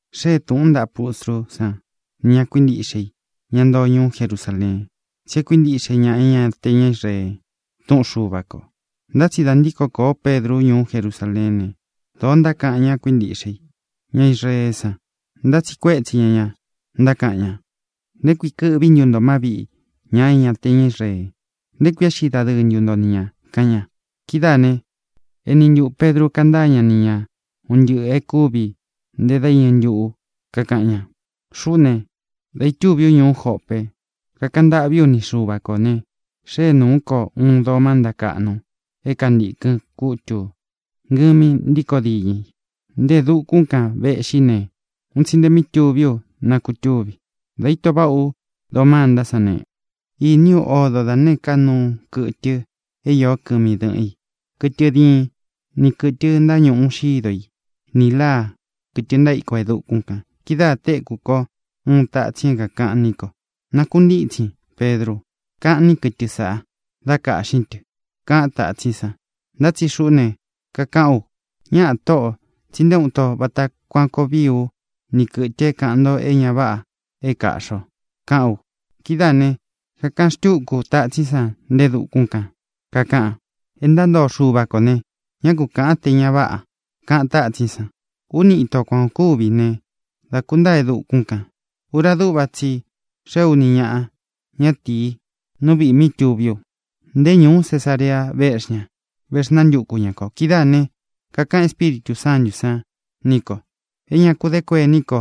Xée tūꞌun ntaꞌa pustrú san nī ña kuíntiꞌxe i, ña ntoo ñuú Jerusaleen, tsí e kuíntiꞌxe ña é ña te ña Israee túꞌun Xuva kō. Ntá tsi dā ntíko kōo Pedru ñuú Jerusaleén ne, dōo ntákaꞌan ña kuíntiꞌxe i, ña Israeé san, ntátsiꞌi kuétsi ña ña, ntákaꞌan ña: —¿Nté kui kɨ́ꞌvi ntu ntō má viꞌi ña é ña te ña Israee? ¿Nté kui éꞌxi dadɨɨ ntu nto ni ñā? —kaꞌan ña. Kidáā ne, eni ntuꞌū Pedru kantáa ña ni ña un ntɨꞌɨ̄ e kúvi nte dá iñɨ ntuꞌū, kakaꞌan ña: —Xuꞌú ne, dā itúvi ú ñuú Jope, kakaꞌan ntâꞌví u ni Xuva kō ne, xée nūú ko uun doo mánta káꞌnu é kantīkɨn kútu ngɨmi ntíkō diñɨ i. Nte e dukún kān véꞌxi ne, un tsi nte mi túvi ú nakutúvi. Dā íto váꞌa ú doo mántá san ne, īní u odo da nēé ka nuu kɨtɨ é īó kɨmi dɨ́ꞌɨn i, kɨtɨ diin, ni kɨ̄tɨ ntáñuꞌu xído i, nī láa, kɨ̄tɨ ntaíko e dukún kān. Kidáā téku ko uun tatsin é kākaꞌan ní ko: “Nakuntítsin, Pedru, kaꞌnín kɨtɨ san, dá kaꞌxīn tɨ”, kaꞌan tátsín san. Ntá tsi xuꞌú ne, kakaꞌán u: “¡Ñáꞌā, Tóꞌō! tsí nté uun ito vata kuan koo vií u ni kɨ̄tɨ é kāꞌan nto é ña váꞌa é kāꞌxi o”, kaꞌán u. Kidáā ne, kakaꞌan xtúku tátsín san nte e dukún kān, kakaꞌan: “É ntantoo Xuva kō ne, ñá ku kāꞌan té ña váꞌa”, kaꞌan tátsín san. Úni ito kuan ō kúvi ne, dá kūntáa e dukún kān. Ura dúꞌva tsi i xee úni ñaꞌa ñatīí nú viꞌī mí tuví u. Nté ñūú Cesarea véꞌxi ña, vexnántuku ñā ko. Kidáā ne, kakaꞌan Espíritū Sántū san ní ko é ña ku dé kuení ko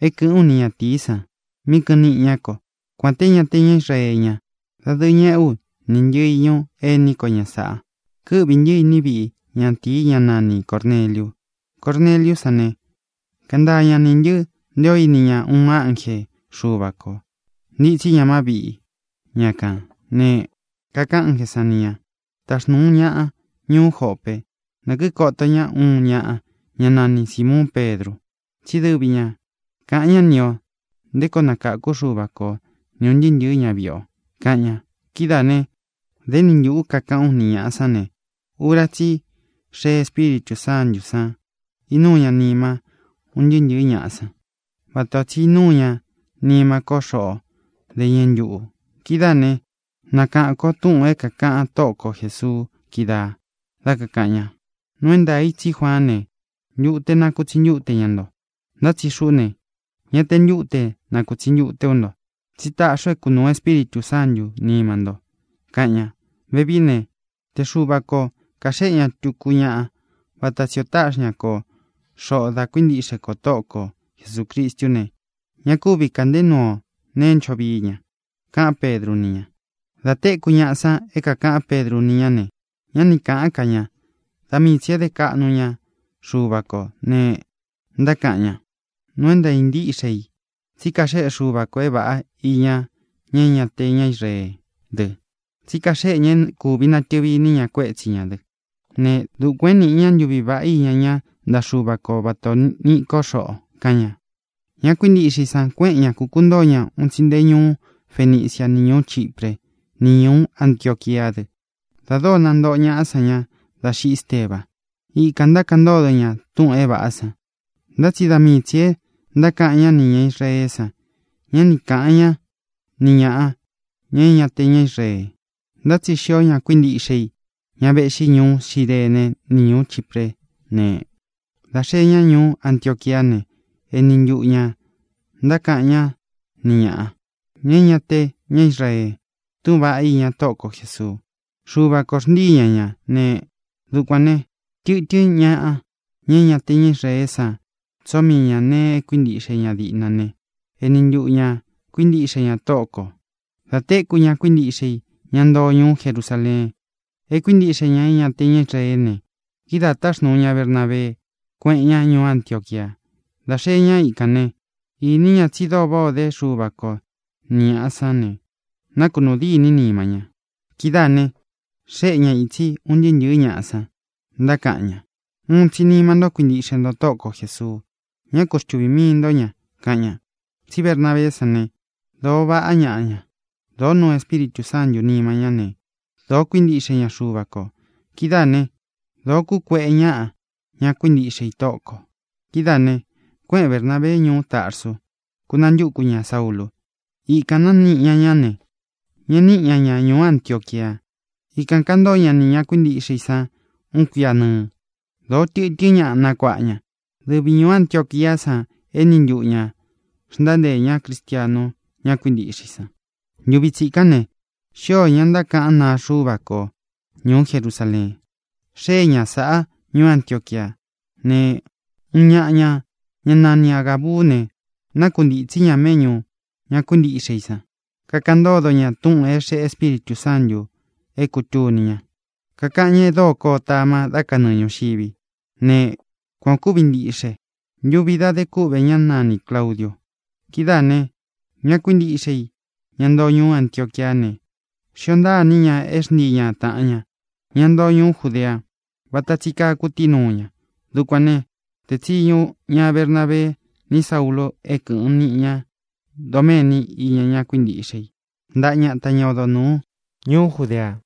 é kɨ̄ꞌɨ́n u ni ñatīí san mí kɨꞌɨn niꞌi ñá ko, kuān té ña te ña Israee ña. Dadɨɨ ñeꞌé u, ni ntɨꞌɨ īñu ení ko ña sāꞌa, kɨ́ꞌvī ntɨꞌɨ ntɨ́ iní viꞌi ñatīi, ñá nani Cōrneliu. Corneliú san ne, kántaa ña nī ntɨ́ nté ō íni ña uun ánje Xuva kō, ntitsí ña má viꞌi ña kān ne, kakaꞌan ánjē sán ni ñā: “Taxnūún ñaꞌa ñuú Jope, na kīkoto ñá uun ñaꞌa, ñá nani Sīmuun Pedru, tsí dɨvi ña kāꞌan ñá ni ō nté koo nakākú Xuva ko o ni ūn ntɨɨ́ ntɨ̄ɨ́ ñaviꞌi o”, kaꞌan ña. Kidáā né, dā éni ntuꞌū ú kakaꞌán u ni ñāꞌa sán ne, ura tsí i xée Espíritū Sántū san, inúu ñá nima ún ntɨɨ́ ntɨ̄ɨ́ ñaꞌa san, vata tsī ó inúu ñá nima ko xoꞌo dá iñɨ ntuꞌū. Kidáā né, nakaꞌān kó túꞌūn é kākaꞌan Tóꞌo ko Jēsuu kídaā dá kakāꞌan ña: “Nuu é ntaā i tsí Juaán ne, ntute nakutsi ntúte ña nto. Ntá tsi xuꞌú ne, ña te ntúte nakūtsi ntute ú nto, tsí taꞌxi u é kunūu Espíritū Sántū nima nto”, kaꞌan ña. Vevií ne, te Xuva ko kāxéꞌe ña tuku ñaꞌa vata tsi ō táꞌxi ña ko xoꞌō dá kuíntiꞌxe kō Tóꞌo ko Jesūcristú ne, ña kúvi kāꞌnté nuu ú neé ncho vii ña —kaꞌán Pedru ni ña. Dā téku ñaꞌa san é kākaꞌán Pedru ni ñá ne, ñá ni kāꞌán ka ña. Da mii tsī é dé kaꞌnu ña Xuva kō ne, ntákaꞌan ña: —Nuu é ntāa ntíꞌxe i tsí kaxéꞌe Xuva kō é vāꞌá iña ña é ña te ña Israeé dɨ. Tsí kaxéꞌe ña é kūvi natɨvi iní ña kuétsi ñā dɨ́ ne, dukuān é nīꞌi ña ntuví vaꞌá iña ña ntaꞌa Xúva ko vata ō niꞌi ko xoꞌo —kaꞌan ña. Ña kuíntiꞌxe i san kuéꞌen ña, kukuntóo ña un tsi nte ñuú Fenicia ni ñūú Chipre, ni ñuú Antioquiá dɨ dā dóo nantoꞌo ñaꞌa san ña dá xiꞌi Ésteba. Ikān ntákaꞌan ntódo ña túꞌūn é vāꞌá san. Ntá tsi da mii tsī é ntákaꞌan ñá nī ña Israeé san; ñá ni kāꞌan ñá ni ñāꞌa, ña é ña te ña Israee. Ntá tsi xío ña kuíntiꞌxe i, ña véꞌxi ñuú Cirene ni ñūú Chipré ne, dā xee ñá ñuú Antioquiá ne, eni ntuꞌu ñā ntákaꞌan ñá ni ñāꞌa, ña é ña te ña Israee túꞌūn vaꞌá iña Tóꞌo ko Jēsuu. Xuva kō xntíi ña ña ne, dukuān né, tɨtɨ́n ñaꞌa, ña é ña te ña Israeé san tsóo mii ña nēe é kuíntiꞌxe diꞌna ña ne, eni ntuꞌu ñā kuíntiꞌxe ña Tóꞌo kō. Dā téku ña kuíntiꞌxe i, ña ntoo ñuú Jerusaleen, é kuíntiꞌxe ña é ña te ña Israeé ne, kidáā táxnūu ña Bernabee, kuéꞌen ña ñuú Antioquia. Dā xeé ña ikān né, īní ña tsí dóo váꞌā o dé Xuva ko ni ñāꞌa sán ne, nakunuu dîní nima ña. Kidáā ne, xéꞌe ña itsi un ntɨɨ́ ntɨ̄ɨ́ ñaꞌa san, ntákaꞌan ña: —Uun tsi nima ntó kuintiꞌxe nto Tóꞌo ko Jēsuu. Ñá ku xtuvī mii nto ña —kaꞌan ña. Tsí Bernabeé san ne, dōo vaꞌá ñaꞌa ña. Dōó nuu Espíritū Sántū nima ñá ne, dōo kuíntiꞌxe ña Xuva kō. Kidáā né, dōó kukueꞌe ñaꞌa, ña kuíntiꞌxe i Tóꞌo kō. Kidáā ne, kuéꞌen Bernābee ñuú Tarsu, kúnantúku ñā Saúlū. Ikān nániꞌi ña ña ne, ñeꞌe níꞌi ña ña ñuú Antioquia. Ikān kantóo ña nī ña kuíntiꞌxe i san uun kuia nɨɨ. Dōo tɨtɨ́n ñaꞌa nakuāꞌa ña. Dɨvi ñūú Antioquiá san éni ntuꞌu ñā xntánteē ñá cristianu ña kuíntiꞌxe i san. Ntuvi tsikán ne, xío ña ntákaꞌán naa Xuva ko ñuú Jerusaleen. Xée ña sāꞌa ñuú Antioquia. Ne, uun ñaꞌa ña, ñá nani Āgabú ne, nákuntītsí ña méꞌñū ña kuíntiꞌxe i san, kakaꞌan ntódo ña túꞌūn é xeꞌé Espíritū Sántū é kūtuni ña, kakaꞌan ñá e dóo koo tama dá kanɨɨ ñūxivi. Ne, kuan ō kúvi ntíꞌxe ntuvi dá de kúꞌve ñá nanī Claudiu. Kidáā ne, ña kuíntiꞌxe i, ña ntoo ñuú Antioquiá ne, xíō ntaa iní ña é xntii ña tāꞌan ña, ña ntoo ñuú Judea, váta tsi kaa kutíi nuu ña. Dukuān né, tēe tsiñu ña Bernabee ni Saúlū é kɨ̄ꞌɨn niꞌi ña doméni iña ña kuíntiꞌxe i ntaꞌa ñata, ña odo nūú ñuú Judea.